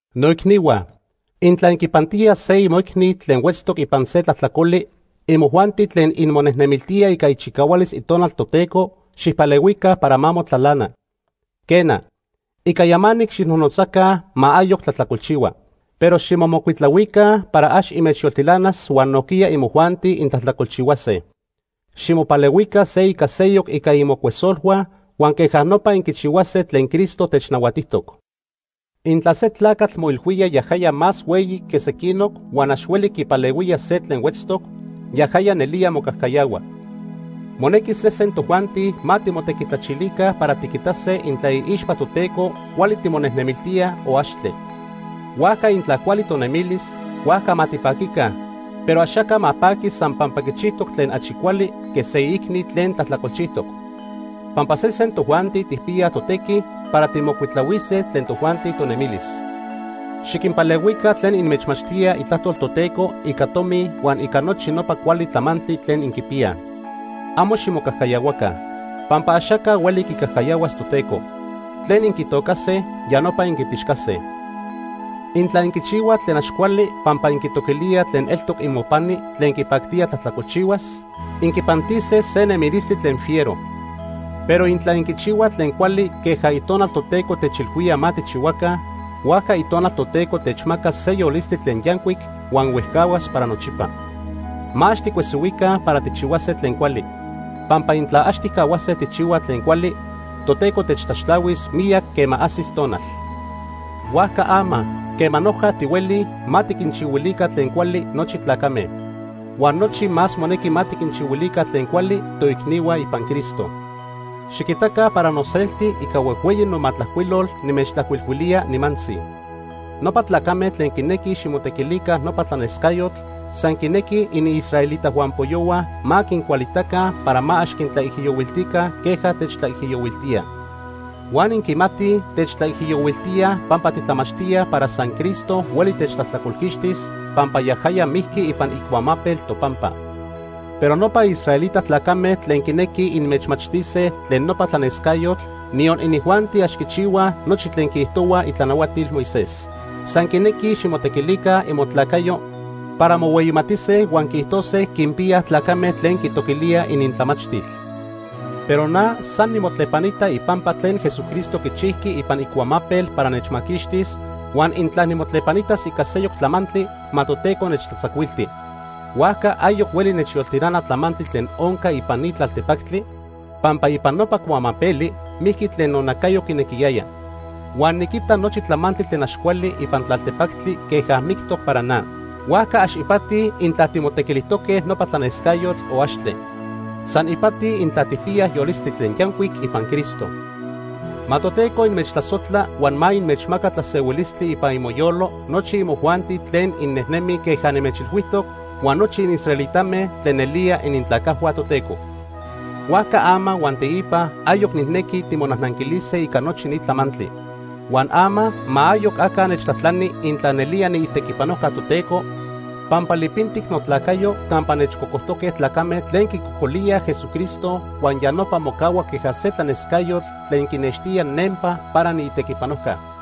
Noicnihua, intla inquipantíaj se imoicni tlen huetztoc ipan se tlajtlacoli, imojuanti tlen inmonejnemiltíaj ica ichicahualis Itonal Toteco xijpalehuica para ma motlalana. Quena, ica yamanic xijnojnotzaca ma ayoc tlajtlacolchihua. Pero ximomocuitlahuica para ax inmechyoltilanas huan nojquiya imojuanti intlajtlacolchihuase. Ximopalehuica se ica seyoc ica imocuesolhua huan queja nopa inquichihuase tlen Cristo technahuatijtoc. Intla se tlacatl moilhuía yajaya más hueyi que sequinoc huan ax hueli quipalehuía se tlen huetztoc, yajaya nelía mocajcayahua. Monequi sesen tojuanti ma timotequitlachilica para tiquitase intla iixpa Toteco cuali timonejnemiltíaj o axtle. Huan intla cuali tonemilis, huajca ma tipaquica, pero axaca ma paqui san pampa quichijtoc tlen achi cuali que se iicni tlen tlajtlacolchijtoc. Pampa sesen tojuanti tijpiyaj totequi para tijmocuitlahuise tlen tojuanti tonemilis. Xiquinpalehuica tlen inmechmachtíaj itlajtol Toteco, ica tomi huan ica nochi nopa cuali tlamantli tlen inquipiyaj. Amo ximocajcayahuaca, pampa axaca hueli quicajcayahuas Toteco. Tlen inquitocase, ya nopa inquipixcase. Intla inquichihuaj tlen ax cuali pampa inquitoquilíaj tlen eltoc imopani tlen quipactía tlajtlacolchihuas, inquipantise se nemilistli tlen fiero. Pero intla inquichihuaj tlen cuali queja Itonal Toteco techilhuía ma tijchihuaca, huajca Itonal Toteco techmacas se yolistli tlen yancuic huan huejcahuas para nochipa. Ma ax ticuesihuica para tijchihuase tlen cuali, pampa intla ax tijcahuase tijchihuaj tlen cuali, Toteco techtlaxtlahuis miyac quema ajsis tonal. Huajca ama, quema noja tihuelij, ma tiquinchihuilica tlen cuali nochi tlacame. Huan achi más monequi ma tiquinchihuilica tlen cuali toicnihua ipan Cristo. Xiquitaca para noselti ica huejhueyi nomatlajcuilol nimechtlajcuilhuilía nimantzi. Nopa tlacame tlen quinequij ximotequilica nopa tlanescayotl san quinequij iniisraelita huampoyohua ma quincualitaca para ma ax quintlaijiyohuiltica queja techtlaijiyohuiltíaj. Huan inquimatij techtlaijiyohuiltíaj pampa titlamachtíaj para san Cristo hueli techtlajtlacolquixtis, pampa yajaya mijqui ipan icuamapel topampa. Pero nopa israelita tlacame tlen quinequij inmechmachtise tlen nopa tlanescayotl, niyon inijuanti ax quichihuaj nochi tlen quiijtohuaj itlanahuatil Moisés. San quinequij ximotequilica imotlacayo para mohueyimatise huan quiijtose quinpiyaj tlacame tlen quitoquilíaj inintlamachtil. Pero na san nimotlepanita ipampa tlen Jesucristo quichijqui ipan icuamapel para nechmaquixtis, huan intla nimotlepanitas ica seyoc tlamantli, ma Toteco nechtlatzacuilti. Huajca ayoc hueli nechyoltilana tlamantli tlen onca ipan ni tlaltepactli, pampa ipan nopa cuamapeli mijqui tlen nonacayo quinequiyaya. Huan niquita nochi tlamantli tlen ax cuali ipan tlaltepactli queja mictoc para na. Huajca ax ipati intla timotequilijtoque nopa tlanescayotl o axtle. San ipati intla tijpiyaj yolistli tlen yancuic ipan Cristo. Ma Toteco inmechtlasojtla huan ma inmechmaca tlasehuilistli ipan imoyolo nochi imojuanti tlen innejnemij queja nimechilhuijtoc huan nochi inisraelitame tlen nelía inintlacajhua Toteco. Huajca ama huan teipa ayoc nijnequi timonajnanquilise ica nochi ni tlamantli. Huan ama ma ayoc aca nechtlajtlani intla nelía niitequipanojca Toteco, pampa lipintic notlacayo campa nechcocojtoque tlacame tlen quicocolíaj Jesucristo huan ya nopa mocahua queja se tlanescayotl tlen quinextía nempa para niitequipanojca.